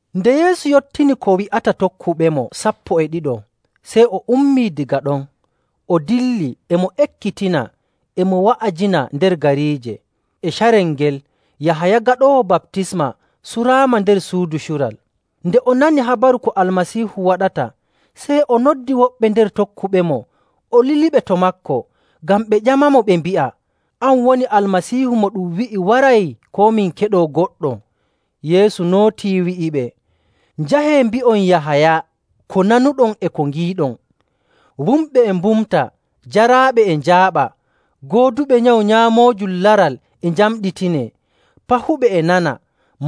Nde Yeesu yottini ko wi'ata tokkuɓemo sappo e ɗiɗo, sey o ummii daga ɗon, o dilli, e mo ekkitina, e mo wa'ajina nder gariije. E carel ngel, Yahaya Gaɗoowo Baptisma suraama nder suudu cural. Nde o nani habaru ko Almasiihu waɗata, sey o noddi woɓɓe nder tokkuɓemo o liliɓe to maako ngam ɓe ƴamamo, ɓe mbi'a, “An woni Almasiihu mo ɗum wi'i waray, koo min keɗoo goɗɗo?” Yeesu nootii, wi'iɓe, “Njahee, mbi'on Yahaya ko nanuɗon e ko ngiiɗon: wumɓe e mbumta, jaraaɓe e njaaɓa, gooduɓe nyawu nyaamoojum laral e njamɗitinee, pahuɓe e nana,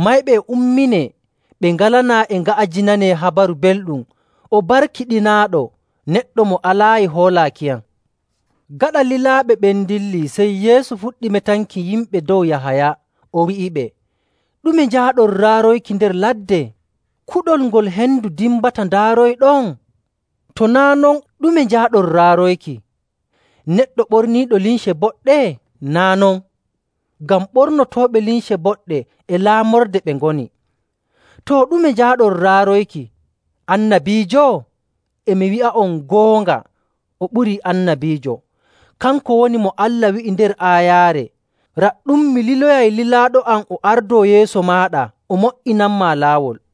mayɓe e umminee, ɓe ngalanaa e nga'ajinanee Habaru Belɗum.. O barkiɗinaaɗo neɗɗo mo alaayi hoolaakiyam.” Gaɗa lilaaɓe ɓen ndilli, sey Yeesu fuɗɗi metanki yimɓe dow Yahaya, o wi'iɓe, “Ɗume njaaɗon raaroyki nder ladde? Kuɗol ngol hendu dimbata ndaaroyɗon? To naa' non, ɗume njaaɗon raaroyki? Neɗɗo ɓorniiɗo limce boɗɗe? Naa' non, ngam ɓornotooɓe limce boɗɗe e laamorde ɓe ngoni. Too, ɗume njaaɗon raaroyki? Annabiijo? E mi wi'a'on goonga, o ɓurii annabiijo. Kanko woni mo Allah wi'i nder aayaare, ‘Raɗɗum, mi liloyay lilaaɗo am o ardoo yeeso maaɗa o mo''inanmaa laawol.’.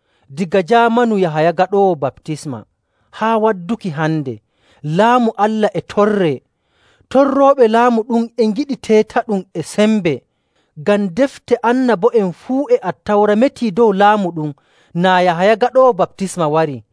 Daga jaamanu Yahaya Gaɗoowo Baptisma haa wadduki hande, Laamu Allah e torree. Torrooɓe laamu ɗum e ngiɗi teetaɗum e sembe. Ngam Defte Annabo'en fuu e Attawra metii dow laamu ɗum naa Yahaya Gaɗoowo Baptisma wari..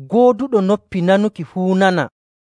Gooduɗo noppi nanuki fuu nana.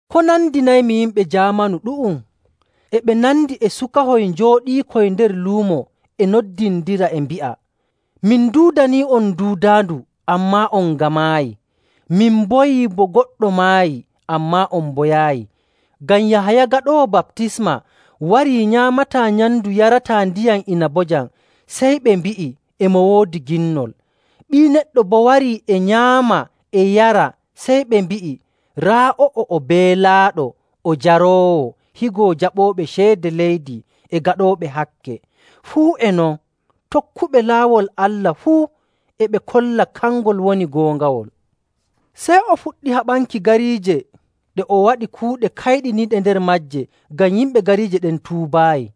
“Ko nandinaymi yimɓe jaamanu ɗu'um? E ɓe nandi e sukahoy njooɗiikoy nder luumo e noddindira, e mbi'a, ‘Min nduudanii'on duudaandu, ammaa on ngamaayi. Min mboyi bo goɗɗo maayi, ammaa on mboyaayi.’ Ngam Yahaya Gaɗoowo Baptisma warii nyaamataa nyamndu yarataa ndiyam inabojam, sey ɓe mbi'i, ‘E mo woodi ginnol.’ Ɓii Neɗɗo boo warii e nyaama e yara, sey ɓe mbi'i, ‘Raa o'o, o beelaaɗo o jaroowo, higo jaɓooɓe ceede leydi e gaɗooɓe hakke.’ Fuu e non, tokkuɓe laawol Allah fuu e ɓe kolla kangol woni goongawol.” Sey o fuɗɗi haɓanki gariije ɗe o waɗi kuuɗe kayɗiniiɗe nder maaje ngam yimɓe gariije ɗen tuubaayi.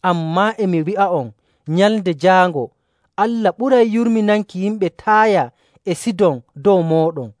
Ammaa e mi wi'a'on, Nyalnde Jaango Allah ɓuray yurminanki yimɓe Taaya e Sidon dow mooɗon.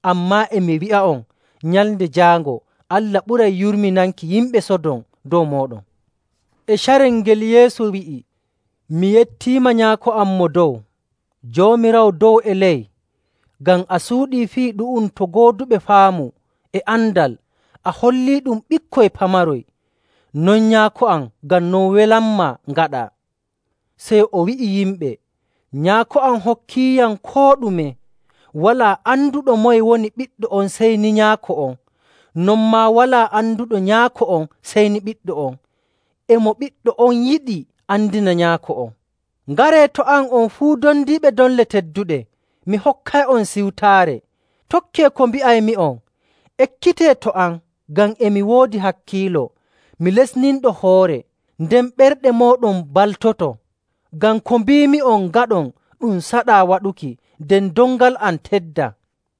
Ammaa e mi wi'a'on, Nyalnde Jaango Allah ɓuray yurminanki yimɓe Sodom dow mooɗon.”. E carel ngel Yeesu wi'i, “Mi yettiima, Nyaako am Mo Dow, Joomiraawo dow e ley, ngam a suuɗii fii ɗu'um to gooduɓe faamu e andal, a holliiɗum ɓikkoy pamaroy. Non Nyaako am, ngam non welanmaa ngaɗaa.” Sey o wi'i yimɓe, “Nyaako am hokkiiyam koo ɗume. Walaa anduɗo moye woni Ɓiɗɗo on sey ni Nyaako on, non maa walaa anduɗo Nyaako on sey ni Ɓiɗɗo on, e mo Ɓiɗɗo on yiɗi andina Nyaako on.. “Ngaree to am on fuu dondiiɓe doŋle tedduɗe, mi hokkay'on siwtaare. Tokkee ko mbi'aymi'on. Ekkitee to am, ngam e mi woodi hakkiilo, mi lestinɗo hoore, nden ɓerɗe mooɗon mbaltoto.. Ngam ko mbiimi'on ngaɗon ɗum saɗaa waɗuki, nden dongal am teddaa.”